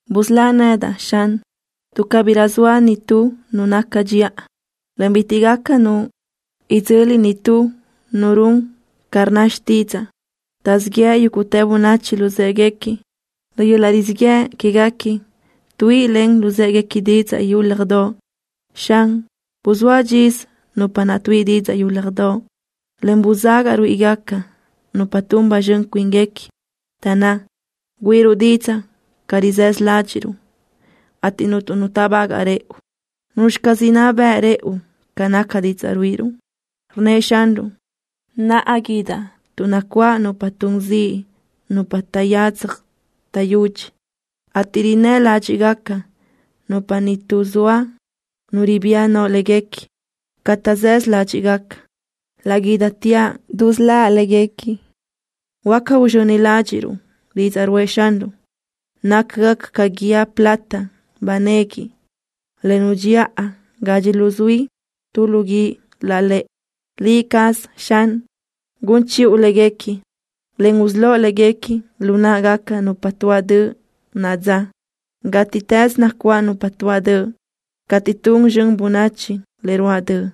Busölá nedaʼ, Xan, tuʼ cabirö zoa nitú nu naca dxiʼa, en bitiʼ gaca nu idzöli nitú nu run ca rnna xtídzaʼa. Taʼzíʼ yeʼe yúguʼtë bönachi luzë́ʼeguequi. Lu yöl-laʼ rizíʼ yëʼ quéguequi tuíʼilen luzë́ʼeguequi didzaʼ yúlajdoʼ. Xan, buzóa dxisö nupa naʼ tuíʼi didzaʼ yúlajdoʼ, en buzagaʼ ruíʼigaca nupa tun ba zxön cuínguequi. Taʼnná: “Güíʼiruʼ didzaʼ ca rizësö ládxiʼruʼ, ateʼ cuntu nu táʼbagaʼ rëʼu. ¿Nuzxi caz inná beʼe rëʼu ca naca didzaʼ ruíʼiruʼ?” Rnnëʼ Xanruʼ: “Naʼa guídaʼ tuʼ nacuáʼ nupa tun ziʼ nupa taʼyadzaj taʼyudxi, ateʼ rinnë́ ládxiʼgaca nupa ni tuʼ zoa nu ribía no léguequi. Ca taʼzësö ládxiʼgaca, laʼ guídateaʼ dusöláʼ léguequi.” Huáca uzxöni ládxiʼruʼ didzaʼ ruʼë Xanruʼ. Nácagaca ca guíë plata ba nequi, le nudxiʼa gadxi luzuí tu lu guíʼ lálëʼe. Liʼ caz, Xan, gun chiʼu léguequi, en usölóʼ léguequi lu náʼagaca nupa tuáʼ döʼ naʼa dza. Gátiʼtës nacuáʼ nupa tuáʼ döʼ, cateʼ tun zxön bönachi le ruáʼ döʼ.